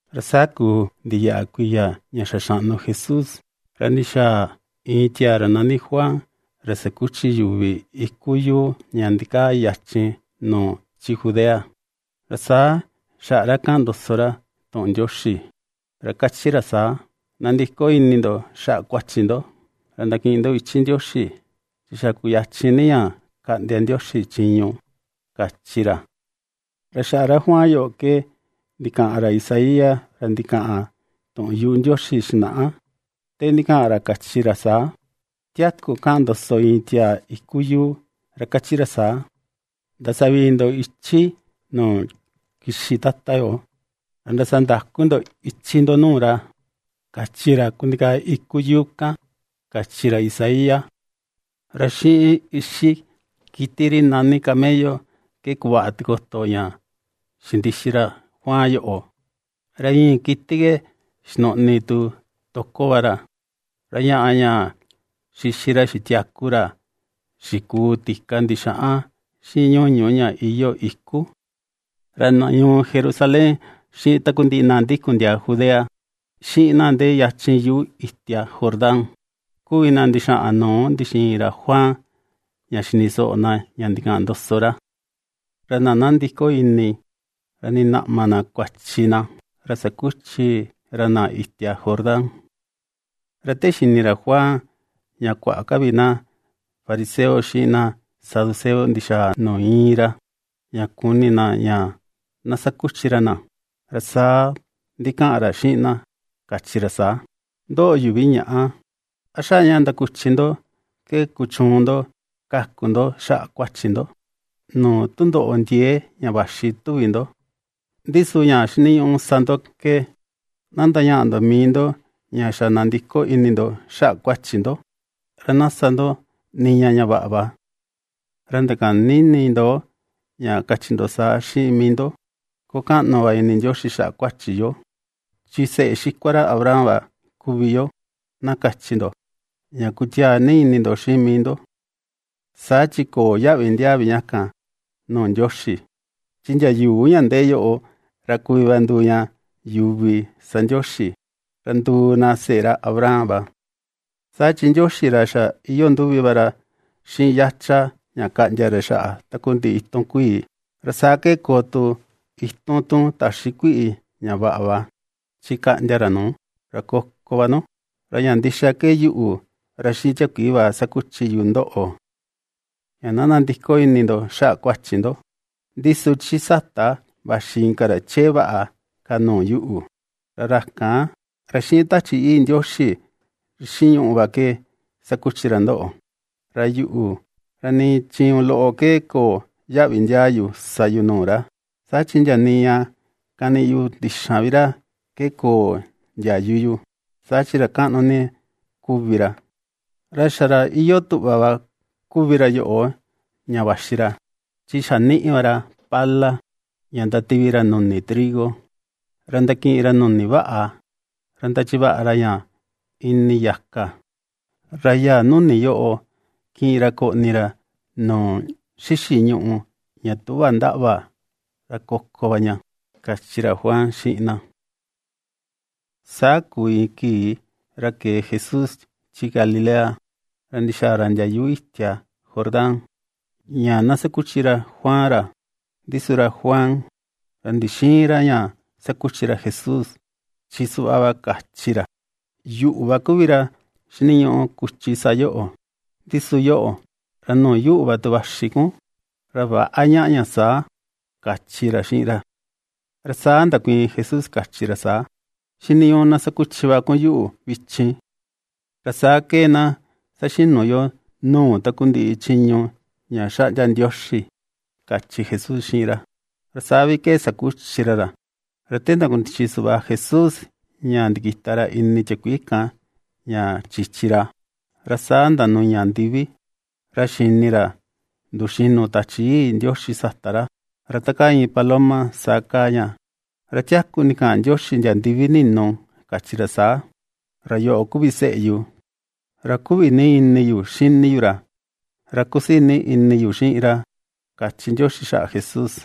Ra saa kuu ndiyaꞌa kuiya ña xa xaꞌnu Jesús, ra ndixaa iin tiaa ra nani Juan ra sakuchi yuvi iku yuu ña ndikaa yachin nuu chi Judea, ra saa xaꞌa ra kaꞌan ndoso ra tuꞌun Ndioxi, ra kachi ra saa: ―Nandiko ini ndo xaꞌa kuachi ndo, ra ndakiꞌin ndo ichi Ndioxi, chi xa kuyachin ni ña kaꞌndia Ndioxi chiñu ―kachi ra. Ra xaꞌa ra Juan yoꞌo ke ndikaꞌan ra Isaías ra ndikaꞌan tuꞌun yuꞌu Ndioxi xinaꞌa, te ndikaꞌan ra kachi ra saa: ^Tiaku kaꞌan ndoso iin tiaa iku yuu ra kachi ra saa: “Ndasavii ndo ichi nuu kixi Tata yo, ra ndasandaku ndo ichi ndo nuu ra”, kachi ra kundikaa iku yuu kan, kachi ra Isaías. Ra xiꞌin ixi kiti ri nani camello ke kuvaꞌa tikoto ña xindixi ra Juan yoꞌo, ra ñii kiti ke xinuꞌni tu toko va ra, ra ñaꞌa ña xixi ra xitiaku ra xikuu tika ndixaꞌan xiꞌin ñuñu ña iyoo iku. Ra na ñuu Jerusalén xiꞌin takundiꞌi na ndikun ndiaa Judea, xiꞌin na ndee yachin yuꞌu itia Jordán, kuvi na ndixaꞌan nuu ndixiin ra Juan ña xini soꞌo na ña ndikaꞌan ndoso ra. Ra na ^nandiko ini, ra ^ndinaꞌma na kuachi na, ra sakuchi ra na itia Jordán. Ra te xini ra Juan ña kuaꞌa ka vi na fariseo xiꞌin na saduceo ndixa̱a̱ nuu íin ra, ña kuni na ña na sakuchi ra na, ra saa ndikaꞌan ra xiꞌin na kachi ra saa: ―¡Ndoꞌo yuvi ñaꞌa! ¿A xaꞌa ña ndakuchi ndo ke kuchuun ndo kaku ndo xaꞌa kuachi ndo, nuu tundoꞌo ndiee ña vaxi, tuvi ndo? Ndi su ña xiniñuꞌu sa ndo ke, na ndañaꞌa ndo mii ndo ña xa nandiko ini ndo xaꞌa kuachi ndo, ra na sa ndo niña ña vaꞌa va. Ra ndakäni ini ndo ña kachi ndo saa xiꞌin mii ndo: “Koo kaꞌnu va ini Ndioxi xaꞌa kuachi yo, chi seꞌe xikua ra Abraham va kuvi yo”, na kachi ndo, ña kutiaa ini ndo xiꞌin mii ndo. Saa chi köo yaꞌvi ndiaa vi ña kan nuu Ndioxi, chi ndia yuu ña ndee yoꞌo ra kuvi va nduu ña yuvi sa Ndioxi, ra nduu na seꞌe ra Abraham va. Saa chi Ndioxi ra xa iyoo nduvi va ra xiꞌin yacha ña kaꞌndia ra xaꞌa takundiꞌi itun kuii, ra saa ke koo tu itun tu täxi kuiꞌi ña vaꞌa va, chi kaꞌndia ra nuu, ra koko va nu. Ra ña ndixa ke yuꞌu, ra xiꞌin tiakuii va ^sakuchi yu ndoꞌo, ña na nandiko ini ndo xaꞌa kuachi ndo, ndi su chi sata vaxi inka ra chee vaꞌa ka nuu yuꞌu, ra ra kan, ra xiꞌin Tachi Yii Ndioxi xiꞌin ñuꞌu va ke sakuchi ra ndoꞌo; ra yuꞌu, ra nii chiñu loꞌo ke köo yaꞌvi ndiaa yu sa yu nuu vi ra, saa chi ndia nii ña kaniꞌi yu ndixan vi ra ke köo ndiayu yu, saa chi ra kaꞌnu ni kuvi ra. Ra xa ra iyoo tuꞌva va kuvi ra yoꞌo ña vaxi ra, chi xa niꞌi va ra pala, ña ndativi ra nuni trigo, ra ndakiꞌin ra nuni vaꞌa ra ndachi vaꞌa ra ña ini yaka, ra yaa nuni yoꞌo kiꞌin ra koꞌni ra nuu xixi ñuꞌu ña tüꞌva ndaꞌva ra koko va ña ―kachi ra Juan xiꞌin na. Saa kuu iin kii ra kee Jesús chi Galilea ra ndixaa ra ndia yuꞌu itia Jordán, ña na sakuchi ra Juan ra. Ndi su ra Juan, ra ndixïin ra ña sakuchi ra Jesús, chi suꞌva va kachi ra: ―Yuꞌu va kuvi ra xiniñuꞌu kuchi sa yoꞌo, ndi su yoꞌo, ra nuu yuꞌu va tu vaxi kun; ra väꞌa ñaꞌa ña saa ―kachi ra xiꞌin ra. Ra saa ndakuiin Jesús kachi ra saa: ―Xiniñuꞌu na sakuchi va kun yuꞌu vichin, ra saa ke na saxinu yo nuu takundiꞌi chiñu ña xaꞌndia Ndioxi ―kachi Jesús xiꞌin ra. Ra saa vi ke sakuchi ra ra. Ra te ndakundichi suꞌva Jesús ña ndikita ra ini tiakuii kan ña chichi ra, ra saa ndanuña ndivi, ra xini ra nduxinu Tachi Yii Ndioxi sata ra; ra ta kaa iin paloma saa kaa ña. Ra tiaku ndikaꞌan Ndioxi ndia ndivi ninu, kachi ra saa: ―Ra yoꞌo kuvi seꞌe yu, ra kuꞌvi ni ini yu xini yu ra, ra kusii ni ini yu xiꞌin ra ―kachi Ndioxi xaꞌa Jesús.